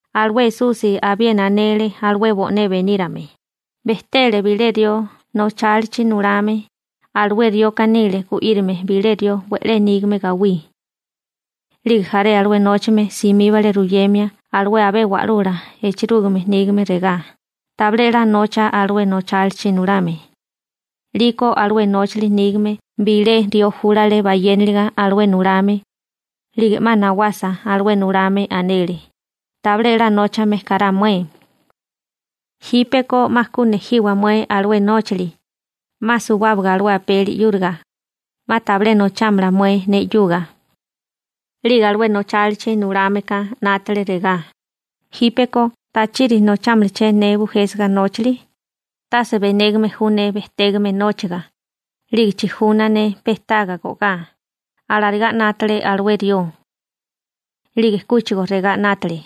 Alué Esusi abiena anele alué bo'né benírame: ―Bejtele bilé rió nochálichi nulame, alué rioka nile gu'írame bilé rió we'lé nígame gawí. 'Lige jaré alué nóchame simíbale ruyemia alué abé wa'lula echerúgime nígame regá: «Tabilé 'la nocha alué nóchalichi nulame.» 'Liko alué nóchali nígame bilé rió júlale bayéniliga alué nulame, 'lige 'ma nawasa alué nulame, anele: «Tabilé 'la nóchame kará mué. Jípeko 'ma ku nejiwa mué alué nóchali, 'ma suwábaga alué apeli 'yúriga. 'Ma tabilé nochámala mué ne 'yuga.» › 'Lige alué nóchalichi nulámeka 'nátale regá: «Jípeko ¿tachiri nochámalaché ne bujésiga nóchali? Tase benégame ju ne bejtégame nóchaga, 'lige chijuna ne pe taga go'gá», alarigá 'nátale alué rió. 'Lige kúchigo regá 'nátale: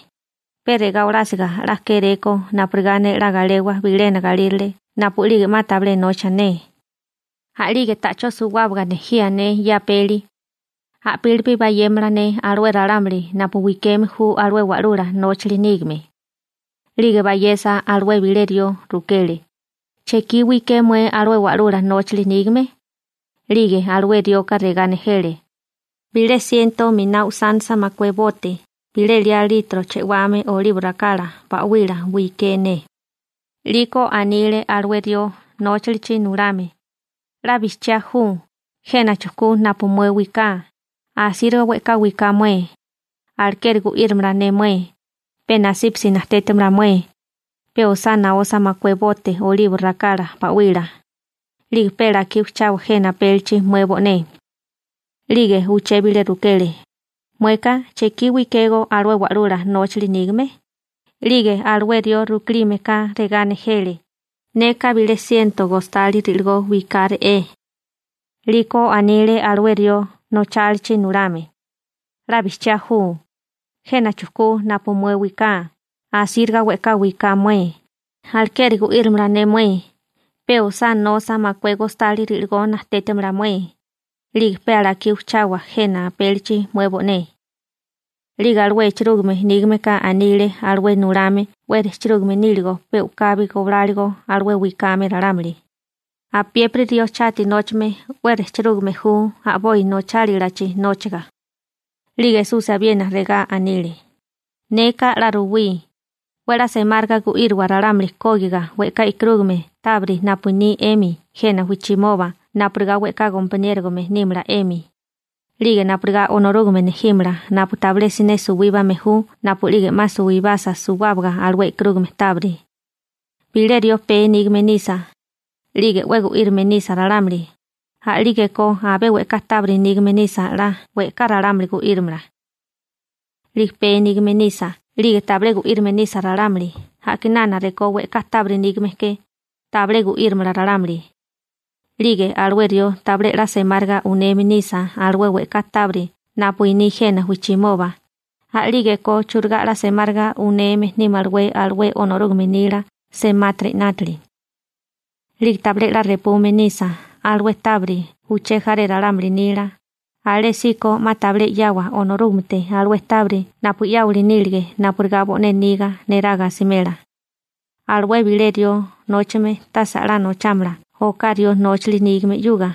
«Pe regá olásiga 'la kéréko, napurigá ne 'la galewa bilena galírale napu'lige 'ma tabilé nocha ne, a'lige ta'chó suwábaga nejía ne ye apeli, i'pílipi bayémala ne alué ralámuli napu wikeme ju alué wa'lula nóchali nígame.» › 'Lige bayesa alué bilé rió, rukele: «¿Chekí wiké mué alué wa'lula nóchali nígame?» 'Lige alué rioka regá nejele: «Bilé siento miná usánisa makué bote bilé liá litro chewame olibo rakala ba'wila wiké ne.» 'Liko anile alué rió nóchalichi nulame: «'La bijchiá ju, jena chujkú napu mué wiká, asíriga we'ká wiká mué. Alekeri gu'írimala ne mué, pe nasípasi najtétimala mué, pe osá nosa makué bote olibo rakala ba'wila, 'lige pe alakí ujchawa jena apélichi mué bo'né.» › 'Lige uché bilé rukele: «Mueka ¿chekí wikégó alué wa'lula nóchali nígame?» 'Lige alué rió rukilime ka regá nejele: «Neka bilé siento gostali ri'ligó wikáre'é.» 'Liko anile alué rió nóchalichi nulame: «'La bijchiá ju, jena chujkú napu mué wiká, asíriga we'ká wiká mué, alekeri gu'írimala ne mué, pe osá nosa makué gostali ri'ligó najtétimala mué, 'lige pe alakí ujchawa jena apélichi mué bo'né.» › 'Lige alué echerúgime nígameka anile alué nulame 'we rejchirúgame níligo pe u'kabi gobláligo alué wikame ralámuli. › Apiépiri rió chati nóchame 'we rejchirúgame ju a'boi nochálilachi nóchaga. 'Lige Esusi abiena regá anile: ―Neka 'la ruwí: 'We 'la semáriga gu'írowa ralámuli kógiga we'ká e'karúgame tábiri napu iní 'emi jena wijchimoba napurigá we'ká gompaniérogame nímala 'emi, 'lige napurigá Onorúgame nejímala napu tabilé siné suwíbame ju napu'lige 'ma suwibasa suwábaga alué e'karúgame tábiri. › Bilé rió pee nígame nisa, 'lige 'we gu'írame nisa ralámuli, a'lígeko abé we'ká tábiri nígame nisa 'la we'ká ralámuli gu'írimala. 'Lige pee nígame nisa 'lige tabilé gu'írame nisa ralámuli, a'kinana rekó we'ká tábiri nígame ke, tabilé gu'írimala ralámuli. 'Lige alué rió tabilé 'la semáriga uneme nisa alué we'ká tábiri napu iní jena wijchimoba, a'lígeko churigá 'la semáriga uneme nímalawé alué Onorúgame nila semátiri 'nátili. 'Lige tabilé 'la repume nisa alué tábiri uché jaré ralámuli nila, alésíko 'ma tabilé 'yawa Onorúgamete alué tábiri napu 'yáwali nílige napurigá bo'né niga neraga asimela. › Alué bilé rió nóchame tase a'lá nochámala oká rió nóchali nígame 'yuga,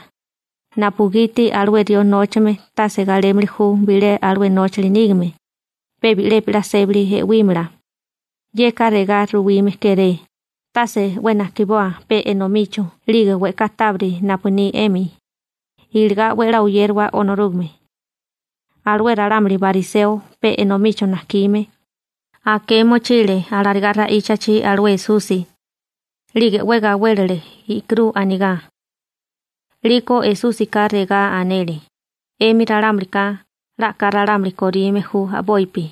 napugiti alué rió nóchame tase galémili ju bilé alué nóchali nígame. Pe bi'lepi 'la sébali e'wímala. Yeka regá ruwime kéré: Tase 'we najkiboa pe enomicho 'lige we'ká tábiri napu ni 'emi, iligá 'we a'lá oyérawa Onorúgame. Alué ralámuli bariseo pe enomicho najkime, aké mochile alarigá ra'íchachi alué Esusi, 'lige 'we gawélele i'kirú anigá. 'Liko Esúsika regá anele: ―'Emi ralámulika 'la a'ká ralámuli korime ju a'bopi,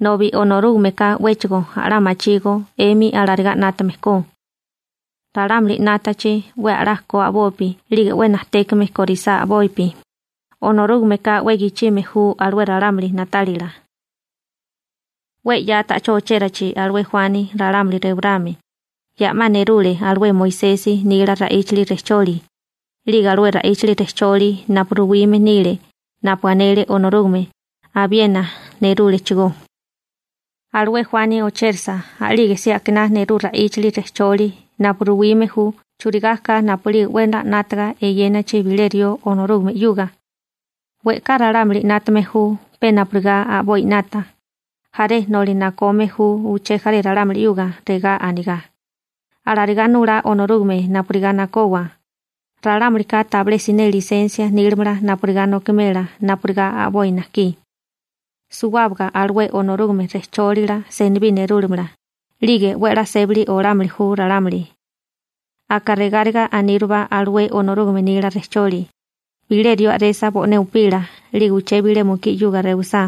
nobi Onorúgameka 'wéchigo a'lá machígó 'emi alarigá 'nátame ko. Ralámuli 'nátachi 'we a'lá ko a'bopi 'lige 'we najtékame korisá a'bopi, Onorúgameka 'we gichime ju alué ralámuli na'tálila. › 'We 'ya ta'chó ochérachi alué Juani ralámuli rewarame, ya 'ma nerule alué Moisesi nila ra'íchali rejcholi, 'lige alué ra'íchali rejcholi napu ruwime nile napu anele Onorúgame abiena nerúlechigó. Alué Juani ochérasa a'lige si akiná nerú ra'íchali rejcholi napu ruwime ju churigá ka napu'lige 'we 'la 'nátaga eyénachi bilé rió Onorúgame 'yuga. We'ká ralámuli 'nátame ju pe napurigá a'boi 'nata. Jaré noli nakome ju uché jaré ralámuli 'yuga regá anigá: «Alarigá nulá Onorúgame napurigá nakowa.» Ralámulika tabilé siné lisensia nílamala napurigá nokimela napurigá a'boi najkí. Suwábaga alué Onorúgame rejchólila senibí nerúlamala, 'lige 'we a'lá sébali olámili ju ralámuli. › Aka regáriga anírubá alué Onorúgame nila rejcholi: Bilé rió a'resa bo'né upila 'lige uché bilé mukí 'yuga rewisá,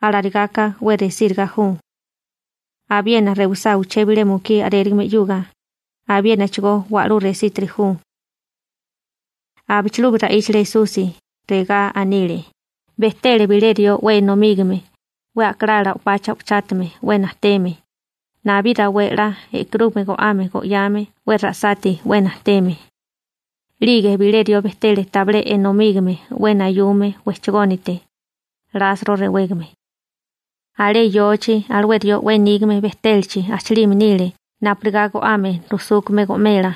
alarigáká 'we resíriga ju. Abiena rewisá uché bilé mukí a'rérigame 'yuga, abiénachigó wa'lú resítiri ju. Abichilubi ra'íchale Esusi, regá anile: ―Bejtele bilé rió 'we enomígame, 'we a'kalala o'pacha o'pachátame 'we najteme, nabí rawé 'la e'karúgame go'ame go'yame 'we ra'sati 'we najteme. 'Lige bilé rió bejtele tabilé enomígame 'we nayume wejchagónite, Lasro rewégame. Alé yochi alué rió 'we nígame bejtélachi ajchalime nile napurigá go'ame rujsúkame go'mela,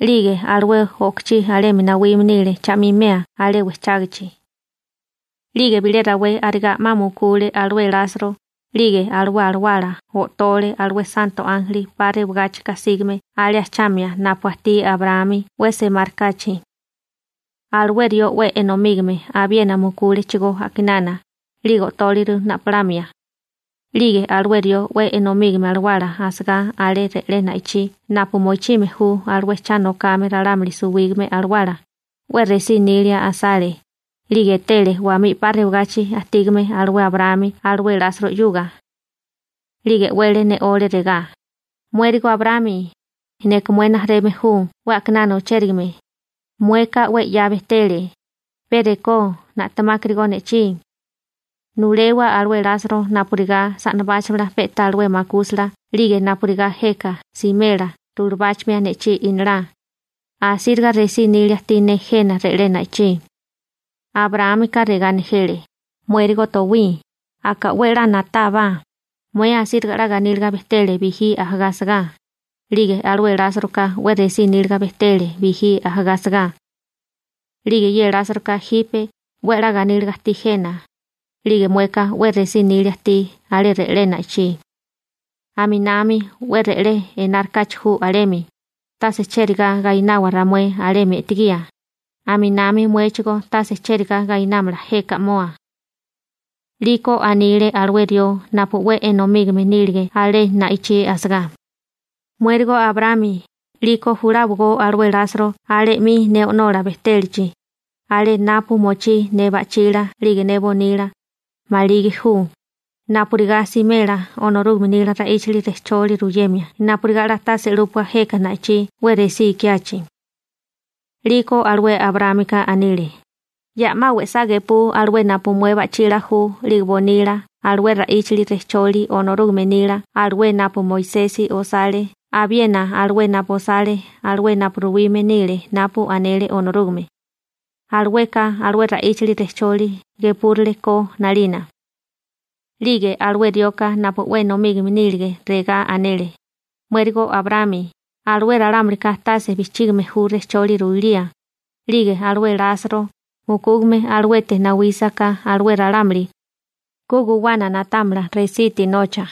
'lige alué o'kochí alemi nawime nile cha'mimea alé wejchágachi. 'Lige bilé rawé arigá 'ma mukule alué Lasro 'lige alué alawala o'tole alué santo ánjeli 'pa rewagáchika sígame alé ajchamia napu ajtí Abraámi 'we semárikáchi. Alué rió 'we enomígame abiena mukúlechigó a'kinana, 'lige o'tóliru na'polamia. › 'Lige alué rió 'we enomígame alawala asagá alé re'lé na'ichí napu mochime ju alué cha nokame ralámuli suwígame alawala, 'we resí nilia asale, 'lige etele wamí 'pa rewagachi ajtígame alué Abraámi alué Lasro 'yuga. 'Lige e'wele ne'ole regá: «Muérigo Abraámi, neka mué rijimala ju 'we a'kinana ochérigame, mueka 'we 'ya bejtele, pe rekó na'temákarigó ne'chí. Nulewa alué Lasro napurigá sa'nabáchamala pe'tá alué makúsala 'lige napurigá jeka simela rulabáchamia ne'chí inalá, asíriga resí nília ajtí ne jena re'lé na'ichí.» Abraámika regá nejele: «Muérigo towí, aka 'we a'lá na'tábá, mué asíriga 'la ganíliga bejtele bijí ajagá asagá, 'lige alué Lásroka 'we resí níliga bejtele bijí ajagá asagá. 'Lige ye Lásroka jipe 'we a'lá ganíliga ajtí jena, 'lige mueka 'we resí nilia ajtí alé re'lé na'ichí. Aminami 'we re'lé enari kachi ju alemi, tase chérigá gainawa ramué alemi e'tegía, aminami muéchigó tase chérigá gainámala jeka 'moa.» › 'Liko anile alué rió napu 'we enomígame nílige alé na'ichí asagá: «Muérigo Abraámi, 'liko juláwagó alué Lasro alé 'mi ne o'nola bejtélachi, alé napu mochí ne ba'chila 'lige ne bonila, maligi ju, napurigá simela Onorúgame nila ra'íchali rejcholi ruyemia napurigá 'la tase 'lúpua jeka na'ichí 'we resí ikiachi.» 'Liko alué Abraámika anile: «Ya 'ma we'sá gepú alué napu mué ba'chila ju 'lige bonila alué ra'íchali rejcholi Onorúgame nila alué napu Moisesi osale abiena alué napu osale alué napu ruwime nile napu anele Onorúgame. Alueka alué ra'íchali rejcholi gepúrale ko 'nalina.» › 'Lige alué rioka napu 'we enomígame nílige regá anele: «Muérigo Abraámi, alué ralámulika tase bijchígime ju rejcholi ruilía, 'lige alué Lasro mukúgame aluete nawísiká alué ralámuli, ku guwana na'támala resiti nocha.» ›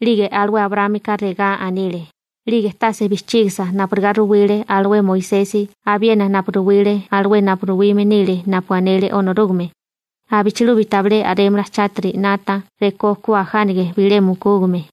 'Lige alué Abraámika regá anile: «'Lige tase bijchígisa napurigá ruwile alué Moisesi abiena napu ruwile alué napu ruwime nile napu anele Onorúgame, abichilubi tabilé a'rémala chátiri 'nata rekó ku ajánige bilé mukúgame.»